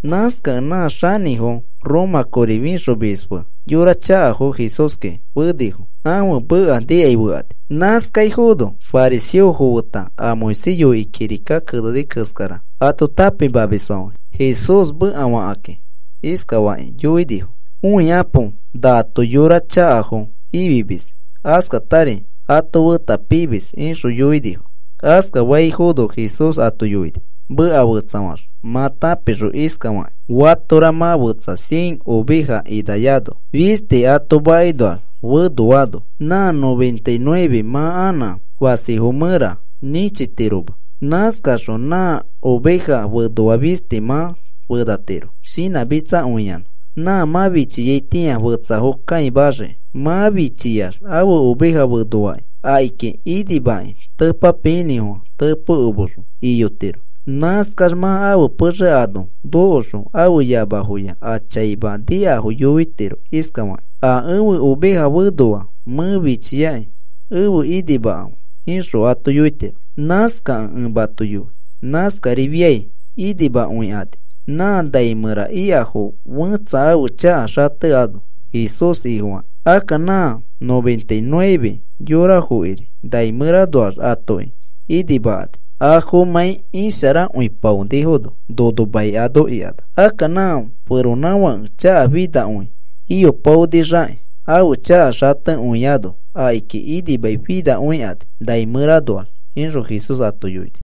Nãskakẽ nã xanĩfo Roma kori fĩxomisfo fe yora chakafo Jesúski fenifo ãfe meka nikai fekani. Nãskaifono fariseofo feta a Moisés yoikĩ kirika keneni keskara ato tãpimamisfãfe Jesús mekafakakĩ iskafakĩ yoinifo: “Õikapo nato yora chakafo ifimis, askatari ato feta pimis,” ixõ yoinifo. Askafaifono Jesús ato yoini meka fetsafaxõ mã tãpixõ iskafakĩ: “Fatora mã fetsa cien oveja inayano fisti ato makinoax fenoano, nã noventa y nueve mã anã fasifo mẽra nĩchitiro. Nãskaxõ nã oveja fenoa fisti mã fenatiro shinãmitsakõiyanã. Nã mã fichiaitĩa fetsafo kãimaxiki. Mã fichiax ãfe oveja fenoaki akiki inimakĩ tepapiinĩfofã tepokomexõ iyotiro. Nãskax mã ãfe pexe ano nokoxõ ãfe yamafoya a chaima nikafo yoitiro iskafakĩ: ‘A ẽfe oveja fenoa. Mẽ fichiakĩ efe inimakãfe,’ ixõ ato yoitiro. Nãskakẽ ẽ mato yoi, nãskarifiai inimakõikani nã nai mẽra ikafo fẽtsa ãfe chaka xatekõiano Jesús Ifofakĩ. Akka nã noventa y nueve yorafokiri nai mẽranoax atokiri inimakani, afomãi isharakõipaonifono nono mai ano ikanax. Akka nã feronãfake chakafinakõi iyopaonixakĩ ãfe chaka xatekõiano akiki inimaifinakõikani nai mẽranoax,” ixõ Jesús ato yoini.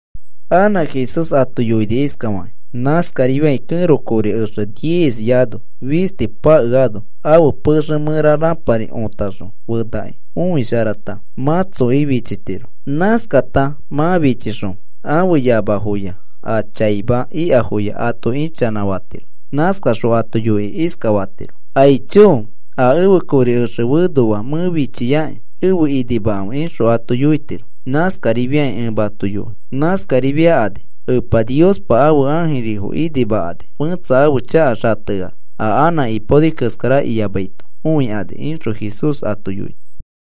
Anã Jesús ato yoini iskafakĩ: “Nãskarifiai kẽro kori exe diezyaano fisti pakeano ãfe pexe mẽra rãpari otaxõ fenakĩ õisharata mãtsokĩ fichitiro. Nãskata mã fichixõ, ãfe yamafoya a chaima ikafoya ato ichanãfatiro. Nãskaxõ ato yoikĩ iskafatiro: ‘¡Aicho! A ẽfe kori exe fenoa mẽ fichiaki efe inimakãfe,’ ixõ ato yoitiro. Nãskarifiakĩ ẽ mato yoi. Nãskarifiakani Epa Niospa ãfe ãjirifo inimakani fẽtsa ãfe chaka xateax a anã ipaoni keskara iyamaito õikani,” ixõ Jesús ato yoini.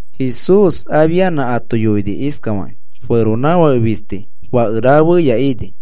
Jesús afianã ato yoini iskafakĩ: “Feronãfake fisti fake rafeya ini.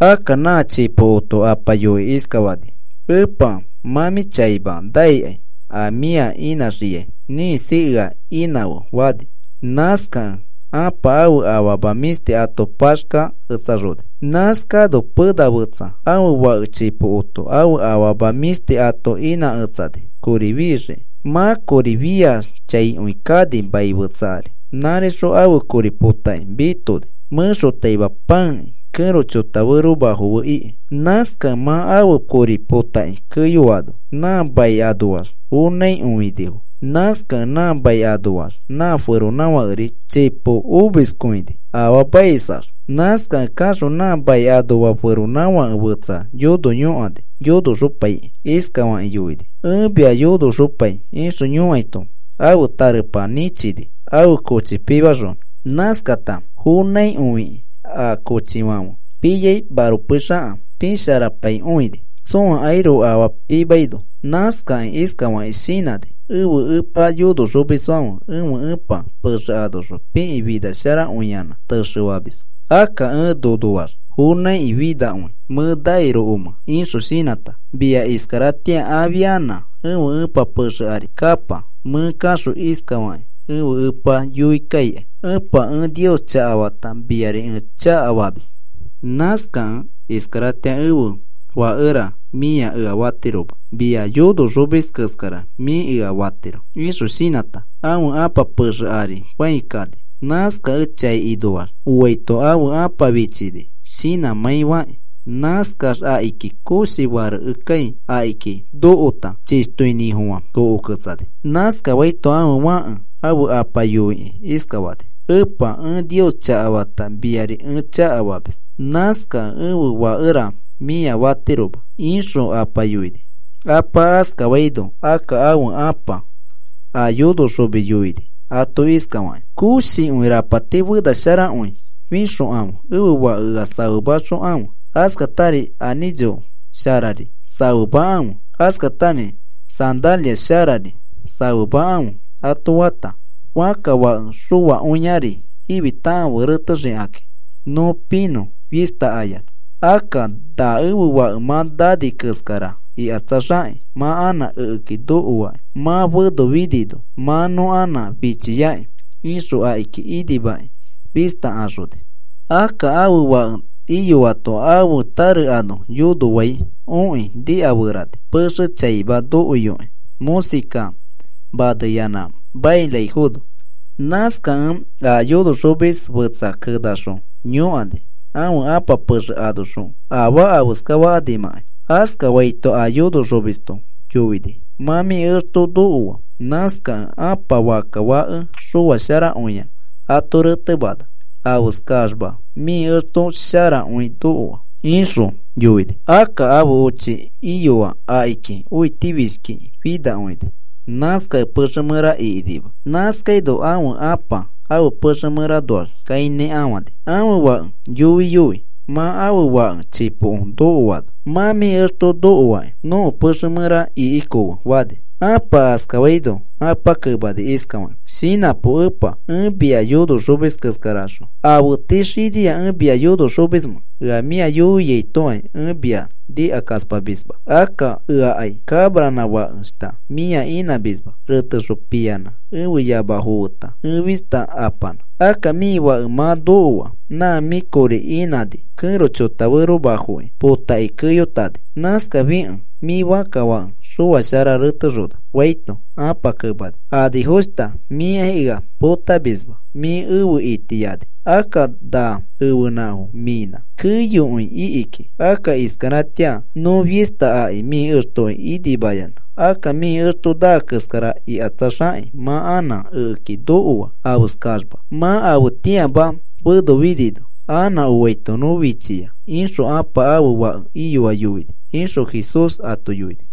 Akka nã chipokoto apa yoikĩ iskafani: ‘Epa, mã mĩ chaima nakĩ a mĩa inãxiai ĩkisi ea inãfe,’ fani. Nãskakẽ ãpa ãfe afama mĩshti ato paxkaketsaxoni. “Nãskano pena fetsa ãfe fake chipokoto ãfe afama mĩshti ato inãketsani kori fixiki. Mã kori fiax chaikõi kani mai fetsa ari. Nãrixõ ãfe kori potakĩ mitoni mẽxotaima pãekĩ kẽro chota feromafo fe ikĩ. Akka mã ãfe kori potakĩ keyoano, nã mai anoaxri fonãikõinifo. Nãskakẽ nã mai anoax nã feronãfakeri chipo omiskõini afaamaisax. Nãskakẽ kaxõ nã mai anoa feronãfake fetsa yono yõkani yonoxopaikĩ, iskafakĩ yoini: ‘Ẽ mia yonoxopai,’ ixõ yõkaito ãfe tarepa nĩchini ãfe kochifo pimaxonõ. Nãskata fonãikõifikĩ a kochifãfe piai maropei xaka pisharapaikõini tsõakairoko afaa pimaino. “Nãskakĩ iskafakĩ shinãni: ‘Ẽfe epa yonoxomisfãfe ẽfe ẽpa pexe anoxõ pikĩ finasharakõiyanã texefamisfo. Akka ẽ nonoax fonãiki finakõi mẽ nairokomẽ,’ ixõ shinãta, ‘Mia iskaratĩa afianã ẽfe ẽpa pexe ari kapa. Mẽ kaxõ iskafakĩ ẽfe epa yoi kaikai, “Epa, ẽ Nios chakafata miari ẽ chakafamis. Nãskakẽ iskaratĩa ẽfe fakera mĩa ea fatiroma. Mia yonoxomisfo keskara mĩ ea fatiro,” ’ ixõ shinãta, ãfe ãpa pexe ari fãi kani. Nãskakẽ chai inoax oaito ãfe ãpa fichini shinãmãi fakĩ. Nãskax akiki koshi farekekãi akiki nokota chishtoinĩfofã kokoketsani. “Nãskafaito ãfe fãke ãfe apa yoikĩ iskafani: ‘Epa, ẽ Nios chakafata miari ẽ chakafamis. Nãskakẽ ẽfe fakera mĩa fatiroma,’ ixõ apa yoini. “Apa askafaino akka ãfe ãpa a yonoxomis yoini ato iskafakĩ: ‘Koshikõi rapati fenasharakõi fĩxokãfe ẽfe fake ea safemaxokãfe, askatari anĩcho sharari safemakãfe, askatari sandalia sharari safemakãfe,’ ato fata, ‘Fãkka fake xoakõiari ifitakãfe retexikakĩ nõ pinõ fista ayanã. Akka na ẽfe fake mã nani keskara ikatsaxakĩ mã anã ekeki nokoaki. Mã fenofinino mã nõ anã fichiaki,’ ixõ akiki inimakĩ fista axoni. “Akka ãfe fake iyoato ãfe tare ano yonofai okĩ nikaferani pexe chaima nokoiyokĩ mõsika maneyanã mairaifono. Nãskakẽ a yonoxomis fetsa kenaxõ yõkani ãfe ãpa pexe anoxõ afaa afeskafakanimãkai. Askafaito a yonoxomisto yoini: ‘Mã mĩ exto nokoa. Nãskakẽ ãpa fakka fake xoa sharakõia ato retemana afeskaxma mĩ exto sharakõi nokoano,’ ixõ yoini. “Akka ãfe ochi iyoa akiki õitifishkiki finakõini. Nãskakẽ pexe mẽra ikinima. Nãskaino ãfe apa ãfe pexe mẽranoax kãinãkafani ãfe fake yoiyoi mã ãfe fake chipoko nokoano, ‘Mã mĩ exto nokoaki. Nõko pexe mẽra ikikofe,’ fani. Ãpa askafaino apa kemani iskafakĩ: ‘Shinãpo epa, ẽ mia yonoxomis keskaraxõ, ¿afe tii xinia ẽ mia yonoxomismẽ? Ea mĩa yoiaitokai ẽ mia nikakaspamisma, akka eakai cabranã fakeshta mĩa inãmisma retexõ piyanã ẽfe yamafo feta ẽ fista apanã. Akka mĩ fake mã nokoa nã mĩ kori inãni kẽro chotaferomafoki potakĩ keyotani. Nãskafikẽ mĩ fãkka fake xoashara retexona,’ faito, ãpa kemani: ‘Anifoshta, mĩkai ea potamisma, mĩ efe itiani. Akka na ẽfenãfo mĩnã, keyokõi iki kiki. Akka iskaratĩa nõ fista aki mĩ extoki inimayanã. Akka mĩ exto naa keskara ikatsaxakĩ, mã anã ekeki nokoa afeskaxma, mã afetĩama fenofinino anã oaito nõ fichia,’ ixõ ãpa ãfe fake iyoa yoini,” ixõ Jesús ato yoini.